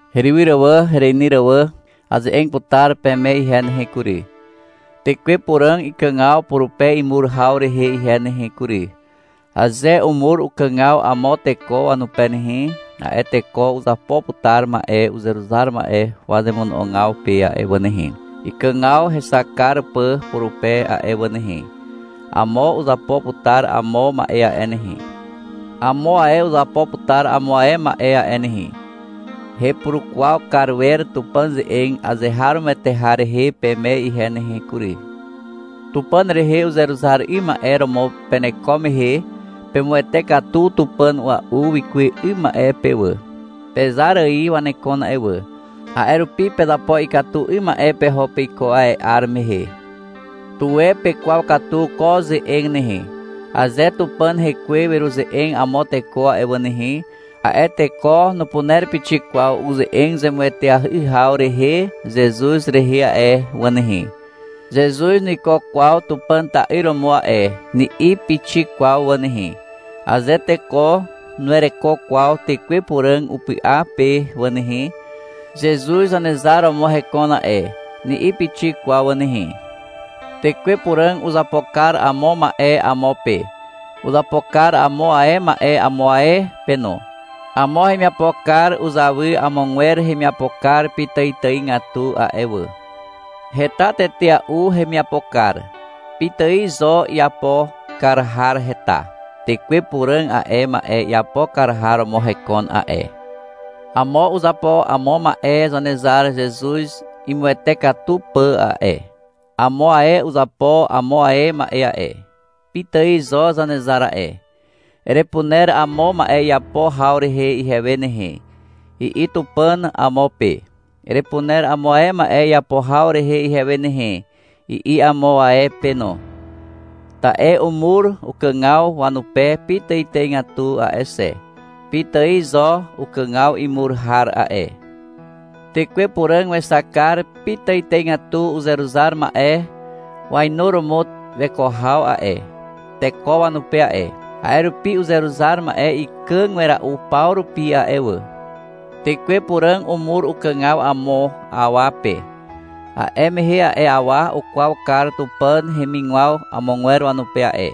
Herywyr wà, hereinyr wà, aze'eg putar peme ihe nehe kury, Tekwe Puràg ikàgaw purupe imur haw rehe ihe nehe kury. Aze umur ukàgaw amo teko wanupe nehe, a'e teko uzapo putar ma'e uzeruzar ma'e wazemono'ogaw pe a'e wà nehe, ikàgaw hexak kar pà purupe a'e wà nehe. Amo uzapo putar amo ma'e a'e nehe. Amo ae uzapo putar amo ae ma'e a'e nehe. Hepurukwaw kar wer Tupàn ze'eg azeharomoete har rehe peme ihe nehe kury. Tupàn rehe uzeruzar 'ym ma'e romo peneko mehe, pemuwete katu tupàn a'ua'u wikuwe 'ym ma'e pe wà. Pezar ài wanekon a'e wà. A'e rupi pezapo ikatu 'ym ma'e peho peiko a'e 'ar mehe. Tuwe pekwaw katu ko ze'eg nehe. Aze Tupàn Hekwe weruze'eg amo teko a'e wà nehe, a'e teko nupuner pixik kwaw uze'eg zemueteahy haw rehe Zezuz rehe a'e wà nehe. — Zezuz nuiko kwaw Tupàn ta'yr romo a'e, ni'i pixik kwaw wà nehe. Aze teko nuwereko kwaw Tekwe Puràg upy'a pe wà nehe, — Zezuz Zanezar romo hekon a'e, ni'i pixik kwaw wà nehe. Tekwe Puràg uzapo kar amo ma'e amo pe. Uzapo kar amo ae ma'e amo ae pe no. Amo hemiapo kar uzawy amogwer hemiapo kar pitàitàigatu a'e wà. Heta tetea'u hemiapo kar. Pitài zo iapo kar har heta. Tekwe Puràg a'e ma'e iapo kar har romo hekon a'e. Amo uzapo amo ma'e Zanezar Zezuz imuawate katu pà a'e. Amo ae uzapo amo ae ma'e a'e. Pitài zo Zanezar a'e. — Erepuner amo ma'e iapo haw rehe ihewe nehe, i'i Tupàn amo pe. — Erepuner amo ae ma'e iapo haw rehe ihewe nehe, i'i amo ae pe no. Ta'e umur ukàgaw wanupe pitàitàigatu a'e xe. Pitài zo ukàgaw imur har a'e. Tekwe Puràg wexak kar pitàitàigatu uzeruzar ma'e wainuromo weko haw a'e, teko wanupe a'e. A'e rupi uzeruzar ma'e ikàg wera'u paw rupi a'e wà. Tekwe Puràg umur ukàgaw amo awa pe, a'e mehe a'e awa ukwaw kar Tupàn hemigwaw amogwer wanupe a'e.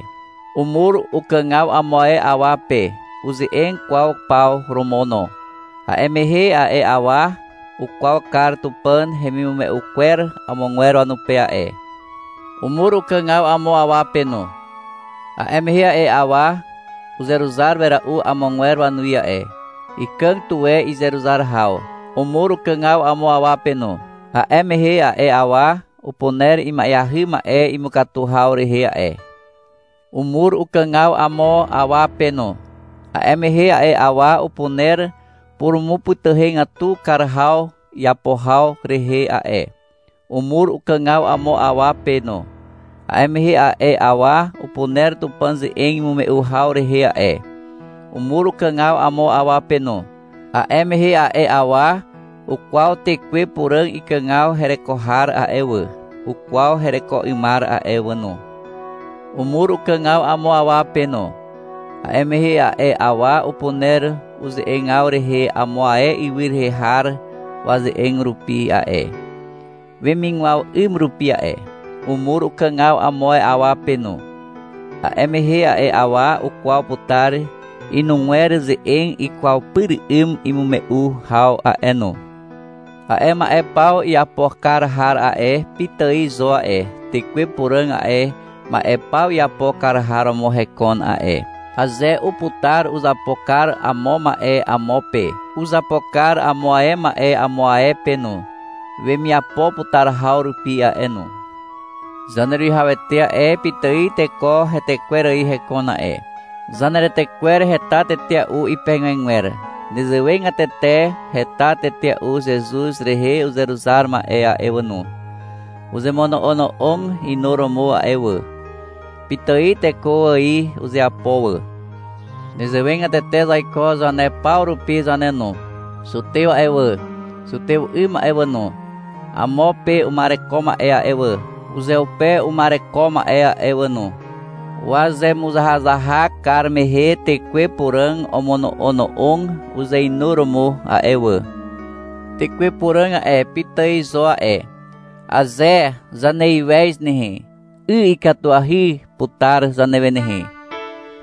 Umur ukàgaw amo ae awa pe uze'eg kwaw paw romo no. A'e mehe a'e awa ukwaw kar Tupàn hemimume'u kwer amogwer wanupe a'e. Umur ukàgaw amo awa pe no. A'e mehe a'e awa uzeruzar wera'u amogwer wanuwi a'e. Ikàg tuwe izeruzar haw. Umur ukàgaw amo awa pe no. A'e mehe a'e awa upuner ima'eahy ma'e imukatu haw rehe a'e. Umur ukàgaw amo awa pe no. A'e mehe a'e awa upuner purumupytyhegatu kar haw iapo haw rehe a'e. Umur ukàgaw amo awa pe no. A'e mehe a'e awa upuner Tupàn ze'eg imume'u haw rehe a'e. Umur ukàgaw amo awa pe no. A'e mehe a'e awa ukwaw Tekwe Puràg ikàgaw hereko har a'e wà, ukwaw hereko 'ymar a'e wà no. Umur ukàgaw amo awa pe no. A'e mehe a'e awa upuner uze'egaw rehe amo ae ywy rehe har waze'eg rupi a'e, wemigwaw 'ym rupi a'e. Umur ukàgaw amo awa pe no. A'e mehe a'e awa ukwaw putar inugwer ze'eg ikwaw pyr 'ym imume'u haw a'e no. A'e ma'e paw iapo kar har a'e, pitài zo a'e, Tekwe Puràg a'e ma'e paw iapo kar har romo hekon a'e. Aze uputar, uzapo kar amo ma'e amo pe, uzapo kar amo ae ma'e amo ae pe no, wemiapo putar haw rupi a'e no. Zaneruwihawete a'e, pitài teko hetekwer ài hekon a'e. Zaneretekwer heta tetea'u ipegegwer. Nezewegatete heta tetea'u Zezuz rehe uzeruzar ma'e a'e wà no. Uzemono'ono'og inuromo a'e wà. Pitài teko ài uzeapo wà. Nezewegatete zaiko zane paw rupi zane no. Zutew a'e wà, zutew 'ym a'e wà no, amo pe uma'ereko ma'e a'e wà, uzeupe uma'ereko ma'e a'e wà no, wazemuzahazahak kar mehe Tekwe Puràg omono'ono'og uzeinuromo a'e wà. Tekwe Puràg a'e, pitài zo a'e. Aze zaneiwez nehe, 'y ikatuahy putar zanewe nehe.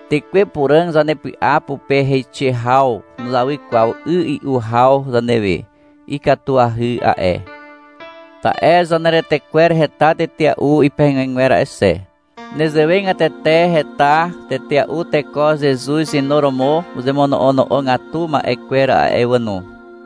Tekwe Puràg zanepy'a pupe heixe haw nuzawy kwaw 'y 'u haw zanewe. Ikatuahy a'e. Ta'e zaneretekwer heta tetea'u ipegegwer a'e xe. Nezewegatete heta tetea'u teko Zezuz inuromo uzemono'ono'ogatu ma'e kwer a'e wà no.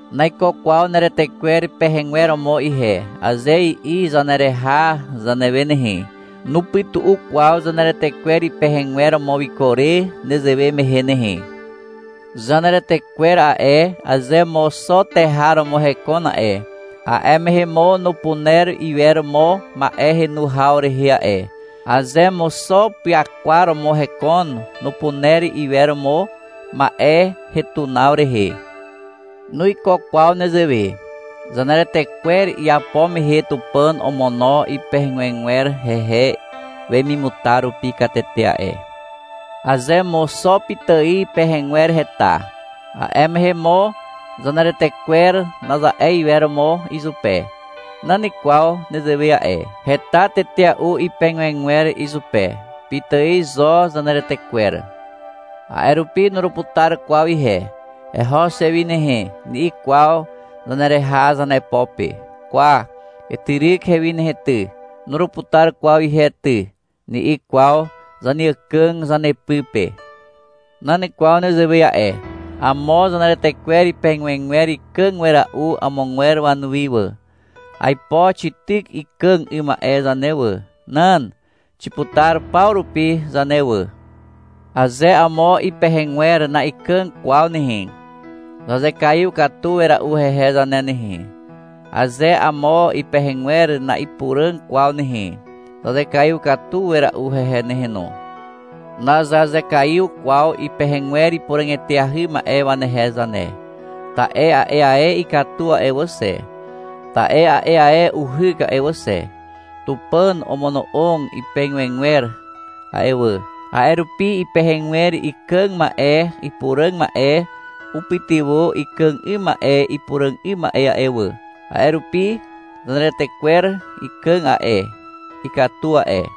— Naiko kwaw neretekwer pehegwer romo ihe, aze i'i zanereha zanewe nehe, nupytu'u kwaw zaneretekwer ipehegwer romo wiko re nezewe mehe nehe. Zaneretekwer a'e, aze mo xo teha romo hekon a'e, a'e mehe mo nupuner iwer mo ma'e henu haw rehe a'e. Aze mo xo pyakwar romo hekon, nupuner iwer mo ma'e hetunaw rehe. Nuiko kwaw nezewe. Zaneretekwer iapo mehe Tupàn omono ipegegwer hehe wemimutar rupi katete a'e. Aze mo xo pitài pehegwer heta, a'e mehe mo — Zaneretekwer, naza'e iwer mo izupe. Nan kwaw nezewe a'e. Heta tetea'u ipegegwer izupe. Pitài zo zaneretekwer. A'e rupi — Nuruputar kwaw ihe, eho xe wi nehe, ni'i kwaw zanereha zanepo pe. — Kwa, etyryk ihewi nehe ty, nuruputar kwaw ihe ty, ni'i kwaw zaneàkàg zanepy pe. Nan kwaw nezewe a'e. Amo zaneretekwer ipegegwer ikàg wera'u amogwer wanuwi wà. Aipo xityk ikàg 'ym ma'e zane wà. Nan. Xiputar paw rupi zane wà. Aze amo ipehegwer na'ikàg kwaw nehe, zazekaiw katu wera'u hehe zane nehe. Aze amo ipehegwer na'ipuràg kwaw nehe, zazekaiw katu wera'u hehe nehe no. Nazazekaiw kwaw ipehegwer ipuràg eteahy ma'e wanehe zane, ta'e a'e ae ikatu a'e wà xe, ta'e a'e ae uhyk a'e wà xe. Tupàn omono'og ipegegwer a'e wà, a'e rupi ipehegwer ikàg ma'e ipuràg ma'e upytywà ikàg 'ym ma'e ipuràg 'ym ma'e a'e wà. A'e rupi zaneretekwer ikàg a'e, ikatu a'e.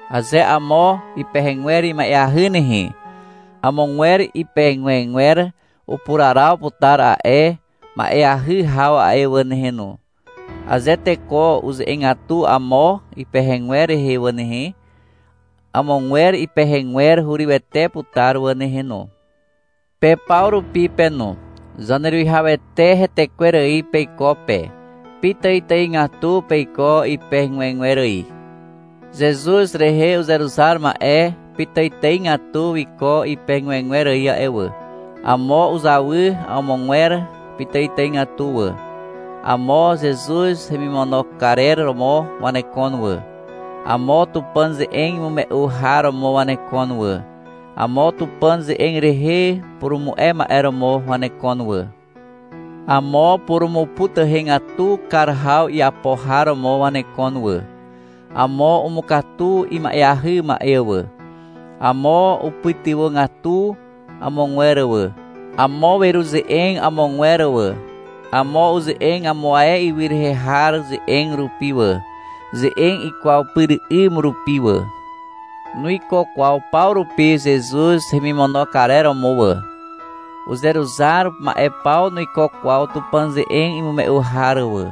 Aze amo ipehegwer ima'eahy nehe, amogwer ipegegwer upuraraw putar a'e ma'eahy haw a'e wà nehe no. Aze teko uze'egatu amo ipehegwer rehe wà nehe, amogwer ipehegwer hurywete putar wà nehe no. Pe paw rupi pe no, Zaneruwihawete hetekwer ài peiko pe. Pitàitàigatu peiko ipegegwer ài. Zezuz rehe uzeruzar ma'e pitàitàigatu wiko ipegegwer ài a'e wà. Amo uzawy amogwer pitàitàigatu wà. Amo Zezuz hemimono karer romo wanekon wà. Amo Tupàn ze'eg imume'u har romo wanekon wà. Amo Tupàn ze'eg rehe purumu'e ma'e romo wanekon wà. Amo purumupytuhegatu kar haw iapo har romo wanekon wà. Amo umukatu ima'eahy ma'e wà. Amo upytywàgatu amogwer wà. Amo weruze'eg amogwer wà. Amo uze'eg amo ae ywy rehe har ze'eg rupi wà, ze'eg ikwaw pyr 'ym rupi wà. Nuiko kwaw paw rupi Zezuz hemimono karer romo wà. Uzeruzar ma'e paw nuiko kwaw Tupàn ze'eg imume'u har wà.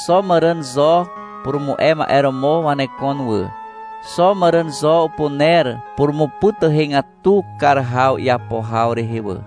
Xo màràn zo purumu'e ma'e romo wanekon wà. Xo màràn zo upuner purumupytuhegatu kar haw iapo haw rehe wà.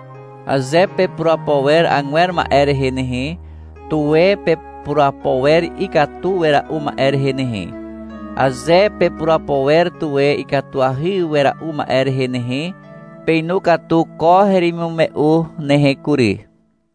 Aze pepurapo wer agwer ma'e rehe nehe, tuwe pepurapo wer ikatu wera'u ma'e rehe nehe. Aze pepurapo wer tuwe ikatuahy wera'u ma'e rehe nehe, peinu katu ko heremimume'u nehe kury.